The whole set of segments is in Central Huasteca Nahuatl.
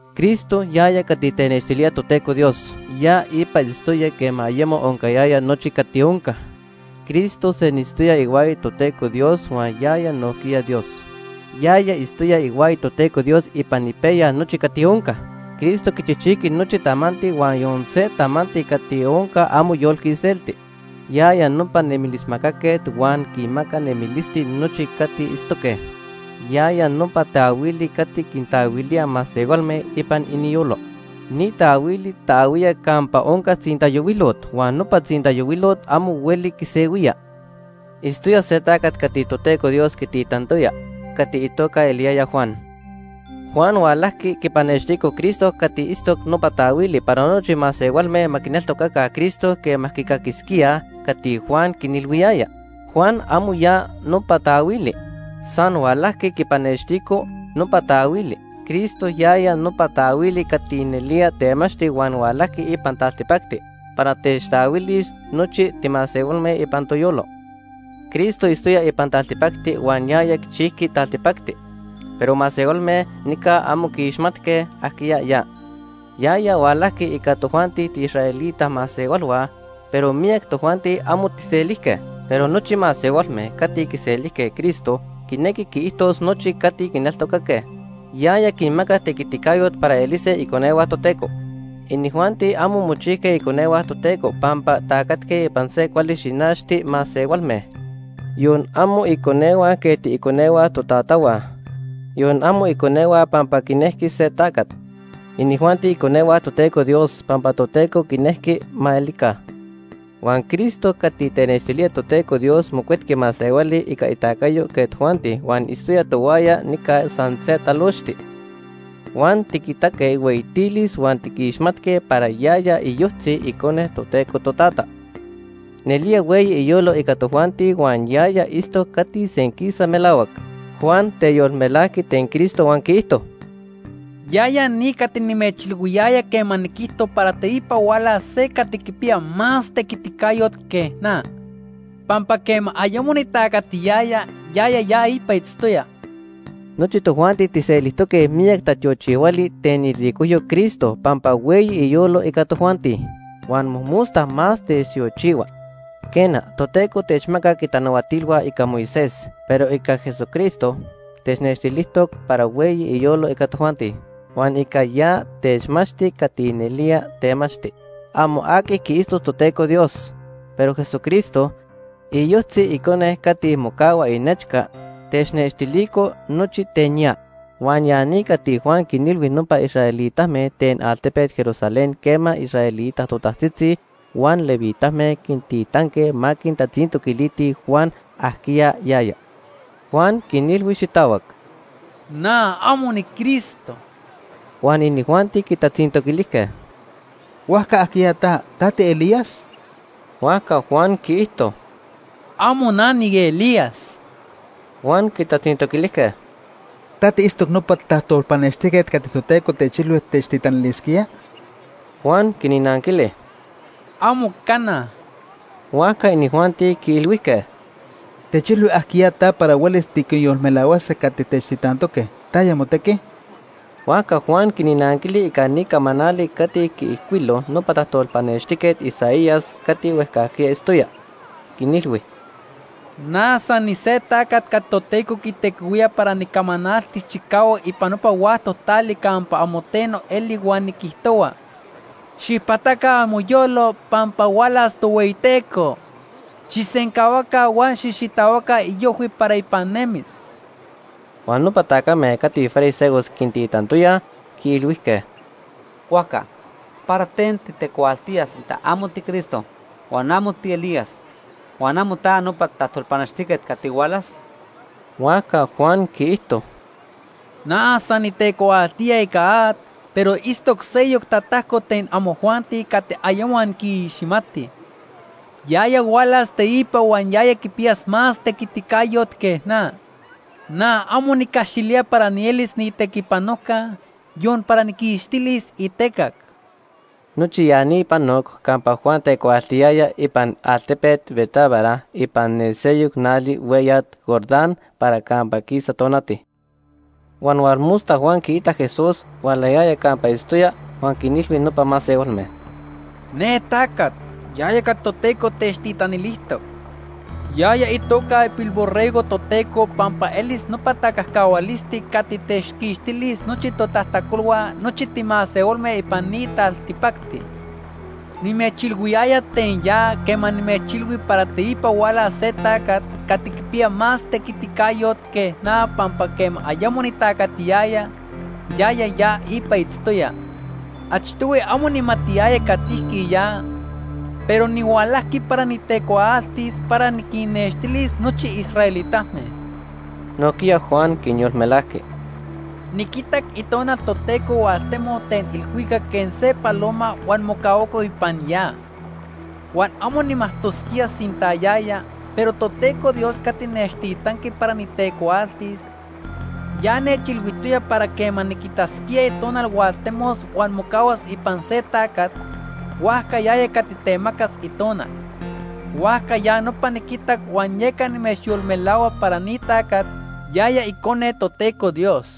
Cristo, yaya cati tenextilía Toteco Dios, ya ipa itztoya quema ayemo oncayaya nochi cati onca. Cristo senitztoya ihuaya Toteco Dios huan yaya nojquiya Dios. Yaya itztoya ihuaya Toteco Dios ipan ipejya nochi cati onca. Cristo quichijchijqui nochi tamanti huan yon se tamanti cati onca amo yolqui iselti. Yaya nopa nemilismacaquet huan quinmaca nemilisti nochi cati itztoque. Yaya nopa taahuili cati quintaahuilía masehualme ipan iniyolo. Ni taahuili taahuía campa onca tzintayohuilot huan nopa tzintayohuilot amo hueli quisehuía. Itztoya se tacat cati Toteco Dios quititantoya cati itoca eliyaya Juan. Juan hualajqui quipanextico Cristo cati itztoc nopa taahuili para nochi masehualme ma quineltocaca Cristo quema quicaquisquíaj cati Juan quinilhuiyaya. Juan amo ya nopa taahuili. San hualajqui quipanextico nopa taahuili. Cristo yaya nopa taahuili cati nelía temachti huan hualajqui ipan taltipacti para techtaahuilis nochi timasehualme ipan toyolo. Cristo itztoya ipan taltipacti huan yaya quichijqui taltipacti, pero masehualme nica amo quiixmatque ajquiya ya. Yaya hualajqui ica tojuanti tiiisraelita masehualhua, pero miyac tojuanti amo tijselijque. Pero nochi masehualme cati quiselijque Cristo, quinequi quiijtos nochi cati quineltocaque Quineltocaque itoca., yaya quinmacac tequiticayot para elise iconehua Toteco. Inijuanti amo mochijque iconehua Toteco pampa tacatque ipan se cuali xinachti masehualme. Yon amo iconehua quej tiiconehua totatahua, yon amo iconehua pampa quinejqui se tacat. Inijuanti iconehua Toteco Dios pampa Toteco quinejqui ma elica. Huan Cristo cati tenextilía Toteco Dios mocuetqui masehuali ica itacayo quej tojuanti huan itztoya tohuaya nica san se talochti. Huan tiquitaque ihueyitilis huan tiquixmatque para yaya iyojtzi Icone Toteco Totata. Nelía hueyi iyolo ica tojuanti huan yaya itztoc cati senquisa melahuac. Juan teyolmelajqui ten Cristo huan quiijto: “Yaya ni cati nimechilhuiyaya quema niquijto para teipa hualas se cati quipiya más itequiticayo que na. Pampa quema ayemo nitacatiyaya, yaya ya ipa itztoya.” Nochi tojuanti tijselijtoque miyac tatiochihuali ten iricojyo Cristo pampa hueyi iyolo ica tojuanti. Huan mojmosta más techtiochihua. Quena, Toteco techmacac itanahuatilhua ica Moisés, pero ica Jesucristo technextilijtoc para hueyi iyolo ica tojuanti. Huan ica ya techmachti cati nelía temachti. Amo aqui quiitztoc Toteco Dios, pero Jesucristo, iyojtzi Icone cati mocahua inechca, technextilico nochi ten ya. Huan ya ni cati Juan quinilhui nopa israelitame ten altepet Jerusalén quema israelita totajtzitzi huan levitame quintitanque ma quitatzintoquilitij Juan ajquiya yaya. Juan quinilhui xitahuac: ―Na amo niCristo. Huan inijuanti quitatzintoquilijque: ―¿Huajca ajquiya ta? ¿Ta tiElías? Huajca Juan quiijto: ―Amo na niElías. Huan quitatzintoquilijque: ―¿Ta tiitztoc nopa tajtolpanextijquet cati Toteco techilhui techtitanilisquía? Juan quinnanquili: ―¡Amo cana! Huajca inijuanti quiilhuijque: ―Techilhui ajquiya ta para huelis tiquinyolmelahuase cati techtitantoque. ¿Taya motequi? Huajca Juan quinnanquili ica ni camanali cati quiijcuilo nopa tajtolpanextijquet Isaías cati huejcajquiya itztoya. Quinilhui: ―Na san nise tacat cati Toteco quitequihuía para nicamanaltis chicahuac ipan nopa huactoc tali campa amo teno eli huan niquijtohua: ‘Xijpataca amoyolo pampa hualas Tohueyiteco. Xijsencahuaca huan xijxitahuaca iojhui para ipan nemis.’ Huan nopa tacame cati fariseos quintitantoyaj, quiilhuijque: ―Huajca, ¿para ten titecuaaltía sinta amo tiCristo huan amo tiElías, huan amo ta nopa tajtolpanextijquet cati hualas? Huajca Juan quiijto: ―Na san nitecuaaltía ica at, pero itztoc seyoc tatajco ten amojuanti cati ayemo anquiixmatij. Yaya hualas teipa huan yaya quipiya más tequiticayot que na. Na amo nicaxilía para nielis niitequipanojca, yon para nijquixtilis itecac. Nochi ya ni panoc campa Juan tecuaaltiyaya ipan altepet Betábara ipan ne seyoc nali hueyat Jordán para campa quisa tonati. Huan hualmosta Juan quiitac Jesús hualayaya campa itztoya huan quinilhui nopa masehualme: “Ne tacat, yaya cati Toteco techtitanilijtoc. Yaya itoca ipilborrego Toteco pampa elis nopa tacajcahualisti cati techquixtilis nochi totajtacolhua nochi timasehualme ipan ni taltipacti. Nimechilhuiyaya ten ya quema nimechilhui para teipa hualas se tacat cati quipiya más tequiticayot que na pampa quema ayemo nitacatiyaya, yaya ya ipa itztoya. Achtohui amo nijmatiyaya catijqui ya, pero nihualajqui para nitecuaaltis para niquinextilis nochi israelitame.” Nojquiya Juan quinyolmelajqui: “Niquitac Itonal Toteco hualtemoc ten ilhuicac quej se paloma huan mocahuaco ipan ya. Huan amo nijmajtosquía sinta yaya, pero Toteco Dios cati nechtitanqui para nitecuaaltis ya nechilhuijtoya para quema niquitasquía Itonal hualtemos huan mocahuas ipan se tacat, huajca yaya cati temacas Itonal. Huajca ya nopa niquitac huan yeca nimechyolmelahua para ni tacat, yaya Icone Toteco Dios.”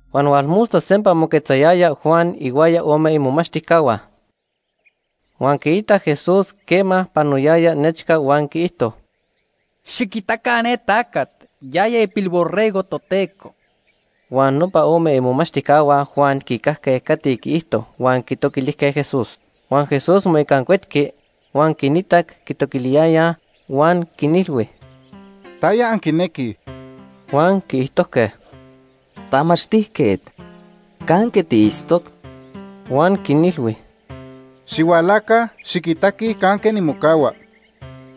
Huan hualmosta sempa moquetzayaya Juan ihuaya ome imomachtijcahua. Huan quiitac Jesús quema panoyaya nechca huan quiijto: ―Xiquitaca ne tacat, yaya ipilborrego Toteco. Huan nopa ome imomachtijcahua Juan quicajque cati quiijto huan quitoquilijque Jesús. Huan Jesús moicancuetqui, huan quinitac quitoquiliyayaj huan quinilhui: ―¿Taya anquinequij? Huan quiijtojque: ―Tamachtijquet, ¿canque tiitztoc? Huan quinilhui: ―Xihualaca, xiquitaquij canque nimocahua.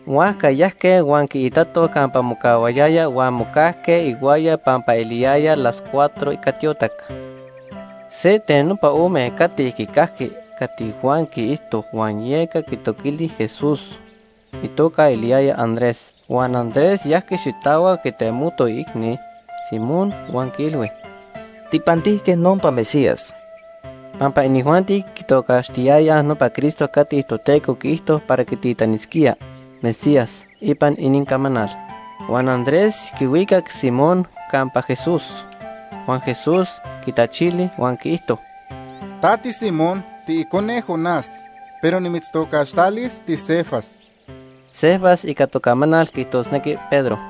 Huajca yajque huan quiitatoj campa mocahuayaya huan mocajque ihuaya pampa eliyaya las cuatro ica tiotac. Se ten nopa ome cati quicajqui cati Juan quiijto huan yeca quitoquili Jesús, itoca eliyaya Andrés. Huan Andrés yajqui xitahuac quitemoto iicni, Simón, huan quiilhui: ―Tijpantijque nopa Mesías. (Pampa inijuanti quitocaxtiyayaj nopa Cristo cati Toteco quiijto para quititanisquía ‘Mesías’ ipan inincamanal.) Huan Andrés quihuicac Simón campa Jesús. Huan Jesús quitachili huan quiijto: ―Ta tiSimón, tiicone Jonás, pero nimitztocaxtalis tiCefas. (Cefas ica tocamanal quiijtosnequi Pedro.)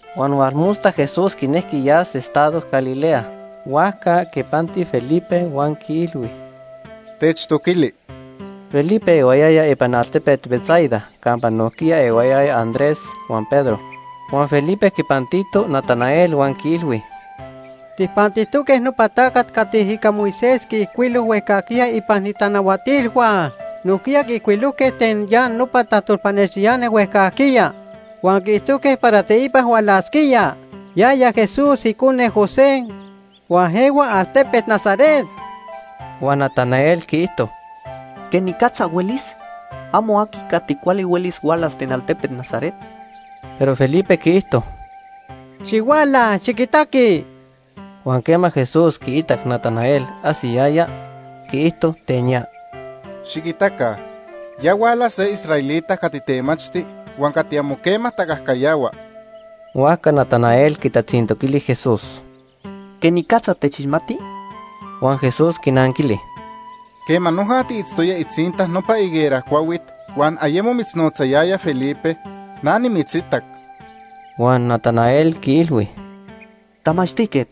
Huan hualmosta Jesús quinejqui yas estado Galilea. Huajca quipanti Felipe huan quiilhui: ―Techtoquili. Felipe ehuayaya ipan altepet Betsaida campa nojquiya ehuayayaj Andrés huan Pedro. Huan Felipe quipantito Natanael huan quiilhui: ―Tijpantijtoque nopa tacat cati ica Moisés quiijcuilo huejcajquiya ipan itanahuatilhua. Nojquiya quiijcuilojque ten ya nopa tajtolpanextiani huejcajquiya huan quiijtojque para teipa hualasquía. Yaya Jesús, icone José, huan ehua altepet Nazaret. Huan Natanael quiijto: ―¿Quenicatza huelis? Amo aqui cati cuali huelis hualas ten altepet Nazaret. Pero Felipe quiijto: ―Xihuala, xiquitaqui. Huan quema Jesús quiitac Natanael ajsiyaya, quiijto ten ya: ―Xiquitaca, ya huala se israelita cati temachti huan cati amo quema tacajcayahua. Huajca Natanael quitatzintoquili Jesús: ―¿Quenicatza techixmati? Huan Jesús quinanquili: ―Quema noja tiitztoya itzinta nopa higuera cuahuit huan ayemo mitznotzayaya Felipe, na nimitzitac. Huan Natanael quiilhui: ―Tamachtijquet,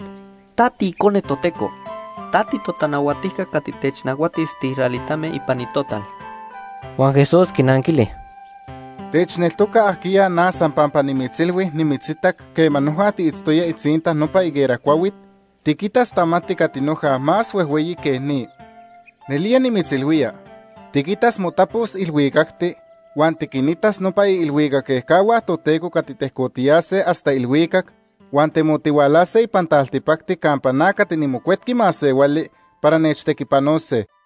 ta tiIcone Toteco. Ta titotanahuatijca cati technahuatis tiisraelitame ipan ni total. Huan Jesús quinanquili: ―¿Techneltoca ajquiya na san pampa nimitzilhui nimitzitac quema noja tiitztoya itzinta nopa higuera cuahuit? Tiquitas tamanti cati noja más huejhueyi que ni. Nelía nimitzilhuía, tiquitas motapos ilhuicacti huan tiquinitas nopa iilhuicac ejcahua Toteco cati tejcotiyase hasta ilhuicac huan temotihualase ipan taltipacti campa na cati niMocuetqui Masehuali para nechtequipanose.